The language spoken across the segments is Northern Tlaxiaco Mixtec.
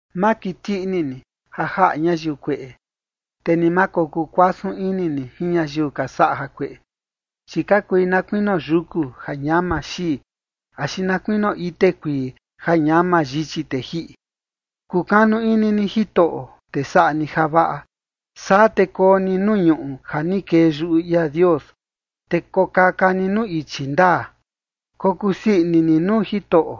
Ma kiti ini ni ja jaꞌa ñayiu kueꞌe, te ni ma kokuu kuasun ini ni jin ñayiu ka saꞌa jakueꞌe. Chi ka kui na kuinio yuku ja ñama xii, axi na kuinio ite kuii ja ñama yichi te jiꞌi. Kukanu ini ni Jitoꞌo, te saꞌa ni javaꞌa, saa te koo ni nuu ñuꞌu ja ni kee yuꞌu ia Dios, te kokaka ni nuu ichi ndaa. Kokusii ini ni nuu Jitoꞌo,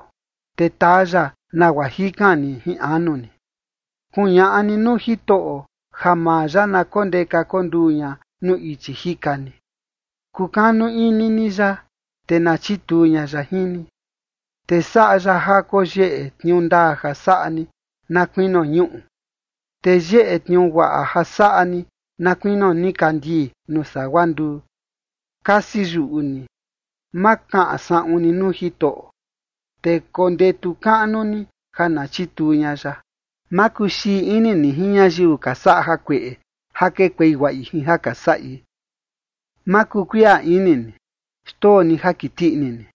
te taa ya nagua jikan ni jin anu ni. Kuñaꞌa ni nuu Jitoꞌo ja maa ya na kondeka kunduu ña nuu ichi jika ni. Kukanu ini ni ya, te na chituu ña ya jin ni. Te saꞌa ya ja koyeꞌe tniuu ndaa ja saꞌa ni na kuinio ñuꞌu, te yeꞌe tniuu guaꞌa ja saꞌa ni na kuinio nikandii nuu sagua nduu. Kasi yuꞌu ni, ma kaꞌan saꞌun ni nuu Jitoꞌo, te kondetu kaꞌnu ni ja na chituu ña ya. Ma kuxii ini ni jin ñayiu ka saꞌa jakueꞌe ja kekuei guaꞌi jin ja ka saꞌi. Ma kukuiꞌa ini ni; xndoo ni ja kiti ini ni.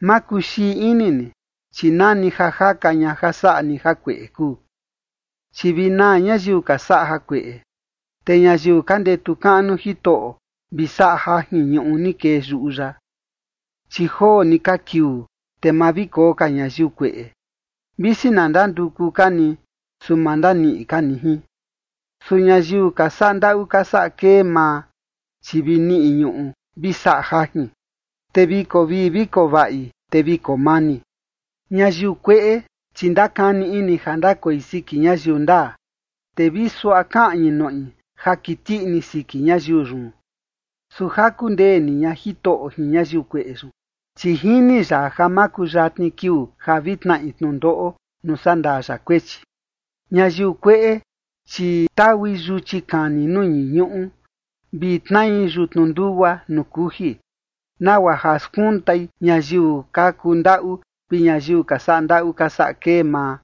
Ma kuxii ini ni, chi nani ja jaka ña ja saꞌa ni jakueꞌe kuu. Chi vi naa ñayiu ka saꞌa jakueꞌe, te ñayiu ka ndetu kaꞌnu Jitoꞌo vi saꞌa jajin ñuꞌu ni kee yuꞌu ya. Chi joo ni ka kiuu, te ma vi koo ka ñayiu kueꞌe. Visi na ndanduku ka ni, su ma ndaniꞌi ka ni jin. Su ñayiu ka saꞌa ndaꞌu ka saꞌa kee maa, chi vi niꞌi ñuꞌu vi saꞌa jajin, te vi koo vii vi koo vaꞌi, te vi koo mani. Ñayiu kueꞌe, chi ndakani ini ja ndakoi siki ñayiu ndaa, te vi suaꞌa kaꞌñi noꞌi ja kiti ini siki ñayiu yun. Su jaku ndee ni ña Jitoꞌo jin ñayiu kueꞌe yun, chi jini ya ja makuyatni kiuu ja vi tnaꞌi tnundoꞌo nuu sandaa ya kuechi. Ñayiu kueꞌe, chi taui yuchi kani nuu ñii ñuꞌu, vi tnai yutnu ndugua nuu kuji, nagua ja skuntai ñayiu ka kundaꞌu vi ñayiu ka saꞌa ndaꞌu ka saꞌa kee maa,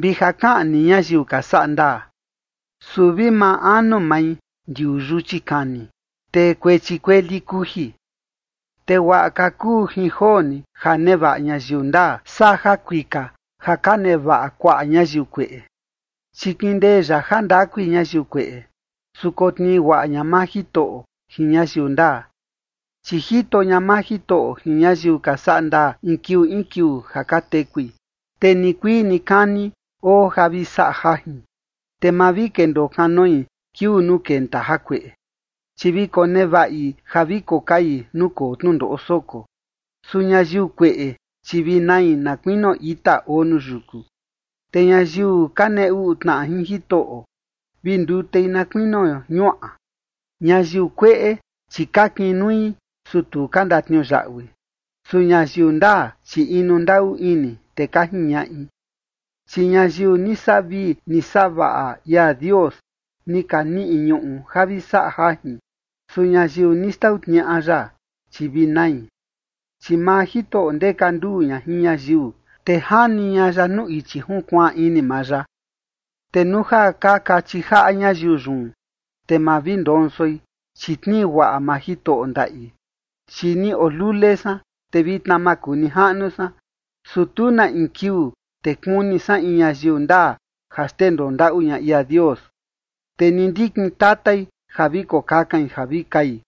vi ja kaꞌni ñayiu ka saꞌa ndaa. Su vi maa anu mai ndiuu yuchi kani, te kuechi kueli kuji. Te guaꞌa ka kuu jin joo ni ja nevaꞌa ñayiu ndaa, saa jakuika ja ka nevaꞌa kuaꞌa ñayiu kueꞌe. Chi kindee ya jandakui ñayiu kueꞌe, su kotnii guaꞌa ña maa Jitoꞌo jin ñayiu ndaa. Chi jito ña maa Jitoꞌo jin ñayiu ka saꞌa ndaa in kiuu in kiuu ja ka tekui, te nikuii nikani oo ja vi saꞌa jajin. Te ma vi kendoo kanoi kiuu nuu kenta jakueꞌe, chi vi konevaꞌi ja vi kokai nuu koo tnundoꞌo soko. Su ñayiu kueꞌe, chi vi nai, na kuinio ita oo nuu yuku, te ñayiu ka nee uꞌu tnaꞌa jin Jitoꞌo, vi ndutei na kuinio ñuaꞌa. Ñayiu kueꞌe, chi ka kinui, su tu ka ndatniuyaꞌui, su ñayiu ndaa, chi inu ndaꞌu ini, te ka jiñaꞌi. Chi ñayiu ni saꞌa vii ni saꞌa vaꞌa ia Dios, ni ka niꞌi ñuꞌu ja vi saꞌa jajin, su ñayiu ni xtau tniaꞌa ya, chi vi nai. Chi maa Jitoꞌo ndeka nduu ña jin ñayiu, te jani ña ya nuu ichi junkuaan ini maa ya. Te nuu ja ka kachi jaꞌa ñayiu yun, te ma vi ndonsoi, chi tnii guaꞌa maa Jitoꞌo ndaꞌi. Chi ni oo lule san, te vitna makunijaꞌnu san, su tu na in kiuu, te kuni san in ñayiu ndaa ja xndendoo ndaꞌu ña ia Dios, te ni ndikin tatai ja vi kokakain ja vi kai.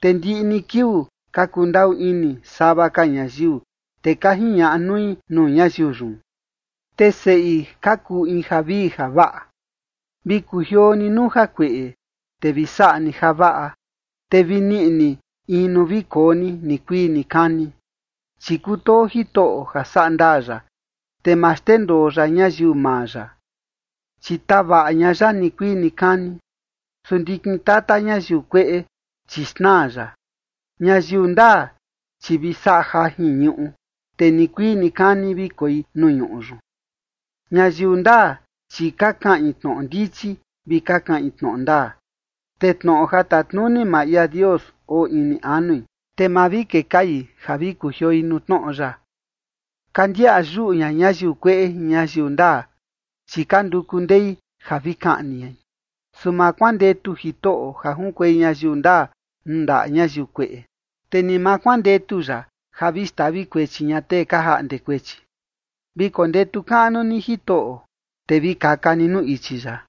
Te ndiꞌi ni kiuu ka kundaꞌu ini sava ka ñayiu, te ka jiñaꞌa nui nuu ñayiu yun, te seꞌi ka kuu in javii javaꞌa. Vi kujioo ni nuu jakueꞌe, te vi saꞌa ni javaꞌa, te vi niꞌi ni in nuu vi koo ni nikuii nikani. Chi kutoo Jitoꞌo ja saꞌa ndaa ya, te ma xndendoo ya ñayiu maa ya, chi tavaꞌa ña ya nikuii nikani, su ndikin tata ñayiu kueꞌe, chi xnaa ya. Ñayiu ndaa, chi vi saꞌa jajin ñuꞌu, te nikuii nikani vi koi nuu ñuꞌu yun. Ñayiu ndaa, chi ka kaꞌin tnoꞌo ndichi, vi ka kaꞌin tnoꞌo ndaa. Te tnoꞌo ja tatnuni maa ia Dios oo ini anui, te ma vi kekai ja vi kujioi nuu tnoꞌo ya. Ka ndiaꞌa yuꞌu ña ñayiu kueꞌe jin ñayiu ndaa, chi ka nduku ndei ja vi kaꞌni ñai. Su ma kuandetu Jitoꞌo ja junkuei ñayiu ndaa nuu ndaꞌa ñayiu kueꞌe, te ni ma kuandetu ya ja vi xtavi kuechi ña tee ka jaꞌnde kuechi. Vi kondetu kaꞌnu ni Jitoꞌo, te vi kaka ni nuu ichi ya,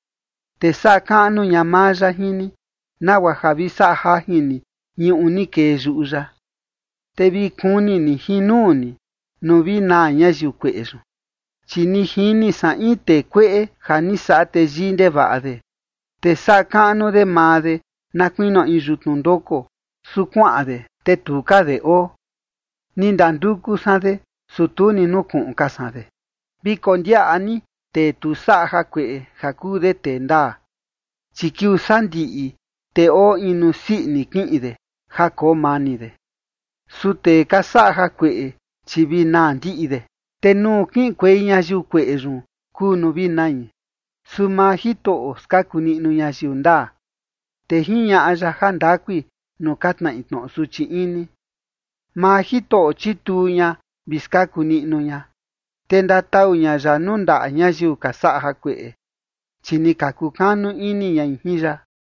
te saꞌa kaꞌnu ña maa ya jin ni, nagua ja vi saꞌa jajin ni ñuꞌu ni kee yuꞌu ya, te vi kuni ni jin nuu ni, nuu vi naa ñayiu kueꞌe yun. Chi ni jini san in tee kueꞌe ja ni saꞌa teyii ndevaꞌa de, te saꞌa kaꞌnu de maa de na kuinio in yutnu ndoko. Su kuaꞌan de, te tu ka de oo. Ni ndanduku san de, su tu ni nukuꞌun ka san de. Vi kondiaꞌa ni tee tu saꞌa jakueꞌe ja kuu de tee ndaa, chi kiuu sandiꞌi, te oo in nuu sii ini kiꞌin de ja koo mani de. Su tee ka saꞌa jakueꞌe, chi vi naa ndiꞌi de, te nuu kiꞌinkuei ñayiu kueꞌe yun kuu nuu vi nai. Su maa Jitoꞌo skaku niꞌnu ñayiu ndaa, te jiñaꞌa ya jandakui nuu ka tnaꞌi tnoꞌo suchi ini. Maa Jitoꞌo chituu ña vi skaku niꞌnu ña. Te ndatau ña ya nuu ndaꞌa ñayiu ka saꞌa jakueꞌe, chi ni ka kukanu ini ñai jin ya.